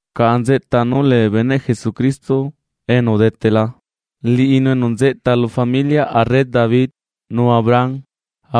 Caꞌa nzeꞌta nú lee bee beneꞌ Jesucristo enu udetela, liꞌinu enu nzeꞌta lu familiaꞌ arre David nu Abraham.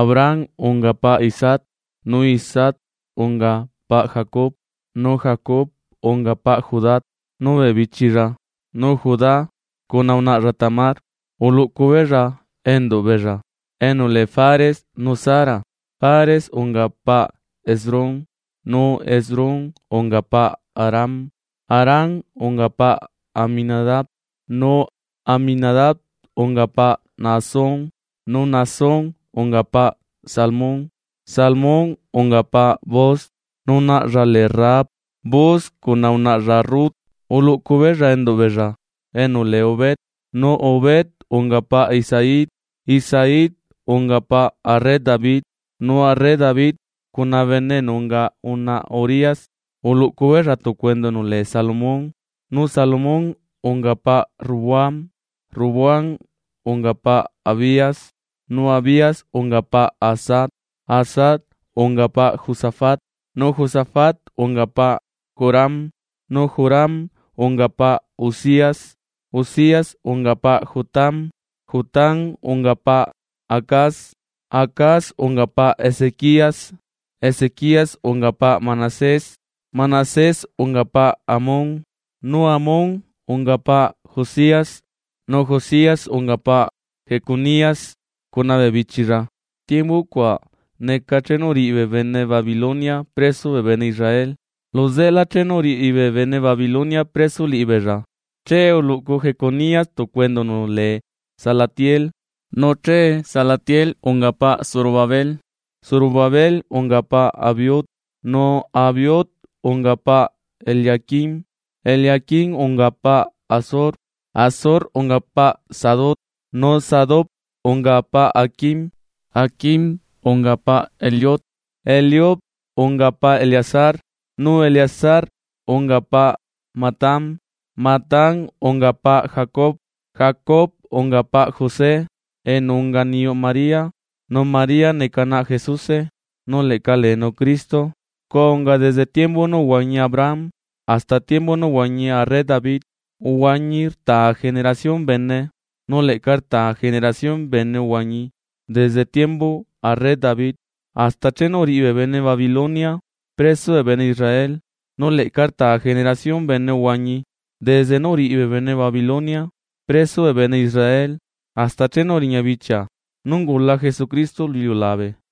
Abraham unga paꞌ Isaac, nu Isaac unga paꞌ Jacob, nu Jacob unga paꞌ Judá nu bee bichilla. Nu Judá cuna unaꞌlla Tamar, uluꞌcu beella enduꞌ beella enu lee Fares nu Zara. Fares unga paꞌ Esrom, nu Esrom unga paꞌ Aram. Aram unga paꞌ Aminadab, nu Aminadab unga paꞌ Naasón, nu Naasón unga paꞌ Salmón. Salmón unga paꞌ Booz, nu naꞌlla lee Rahab. Booz cuna unaꞌlla Rut uluꞌcu beella enduꞌ beella enu lee Obed. Nu Obed unga paꞌ Isaí. Isaí unga paꞌ arre David, nu arre David cuna bene enu unga unaꞌa Urías, uluꞌcu beella tucu enduꞌ enu lee Salomón. Nu Salomón unga paꞌ Roboam, Roboam unga paꞌ Abías, nu Abías unga paꞌ Asá. Asá unga paꞌ Josafat nu Josafat unga paꞌ Joram nu Joram unga paꞌ Uzías. Uzías unga paꞌ Jotam, Jotam unga paꞌ Acaz. Acaz unga paꞌ Ezequías. Ezequías unga paꞌ Manasés, Manasés unga paꞌ Amón, nu Amón unga paꞌ Josías. Nu Josías unga paꞌ Jeconías cuna bee bichilla, tiembu cuaꞌ neca chenu uriꞌi bee bene Babilonia preso bee bene Israel. Luzeꞌelá chenu uriꞌi bee bene Babilonia preso liꞌibeella, che uluꞌcu Jeconías tucu enduꞌ enu lee Salatiel, nu che Salatiel unga paꞌ Zorobabel. Zorobabel unga paꞌ Abiud, nu Abiud unga paꞌ Eliaquim, Eliaquim unga paꞌ Azor. Azor unga paꞌ Sadoc, nu Sadoc unga paꞌ Aquim, Aquim unga paꞌ Eliud. Eliud unga paꞌ Eleazar, nu Eleazar unga paꞌ Matán, Matán unga paꞌ Jacob. Jacob unga paꞌ José enu unga niyuꞌ María. Nu María neca naꞌ Jesuse nu leꞌca leenu Cristo. Scua unga desde tiembu nú uhuañi Abraham hasta tiembu nú uhuañi arre David, uhuañi rtaa generación bene, nu leꞌca rtaa generación bene uhuañi desde tiembuꞌ arre David hasta chenu uriꞌi bee bene Babilonia preso bee bene Israel. Nu leꞌca rtaa generación bene uhuañi desde nú uriꞌi bee bene Babilonia preso bee bene Israel hasta chenu uriña bichia nú ungula Jesucristo lu iliulabe.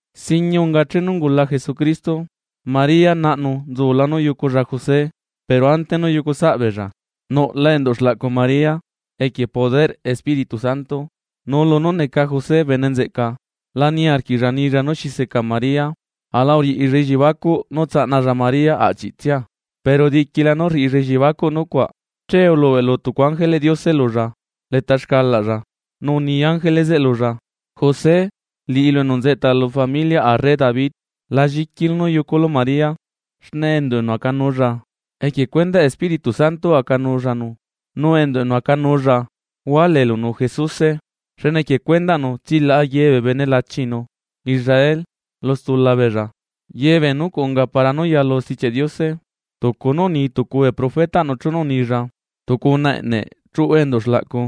Singuie unga chenu ungula Jesucristo: María naꞌnu nzula nú yuculla José, pero ante nú yucusaꞌbeella, nuꞌla enduꞌ xlaꞌcu María equie poderꞌ Espíritu Santo. Nu lunú neca José bene nzeꞌca lá niarquiꞌlla nilla nú xi seca María aꞌla uriꞌilla elliebacuꞌ nú tsaꞌnalla María aꞌchiꞌtsia. Pero diquila nú rriꞌilla elliebacuꞌ nucuaꞌ, che ulubeꞌlu tucu ángeleꞌ Diose lulla leta xcalaꞌlla, nu uni ángele zeꞌe lulla: ―José, liꞌilu enu nzeꞌta lu familiaꞌ arre David, la lliquilu nú yuculu María xne enduꞌ enu acanuulla equie cuendaꞌ Espíritu Santo acanuullanu. Nu enduꞌ enu acanuulla hualeelunu Jesuse. Xne equie cuendaꞌnu tsilaꞌa ye bee bene lachinu Israel lu stula beella. Ye bee nucuaꞌ unga para nú yalu Stichiaꞌ Diose tucu nú uni tucu bee profetaꞌnu chenu unilla: Tucu unaꞌa eꞌne chuꞌu enduꞌ xlaꞌcu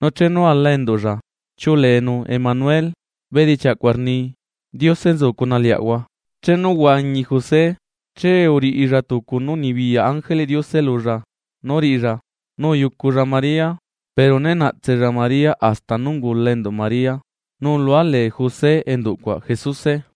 nu chenu ala enduꞌlla, chiuꞌuleenu Emanuel, bedichiaꞌ cuaꞌ rni: Diose nzu cuna liaꞌahua. Chenu uhuañi José, che uriꞌilla tucu nú unibiyaꞌ ángeleꞌ Diose lulla nú riꞌilla, nu uyuculla María. Pero né naꞌtsella María hasta nú ungula enduꞌ María, nu ulualee José enduꞌcuaꞌ Jesuse.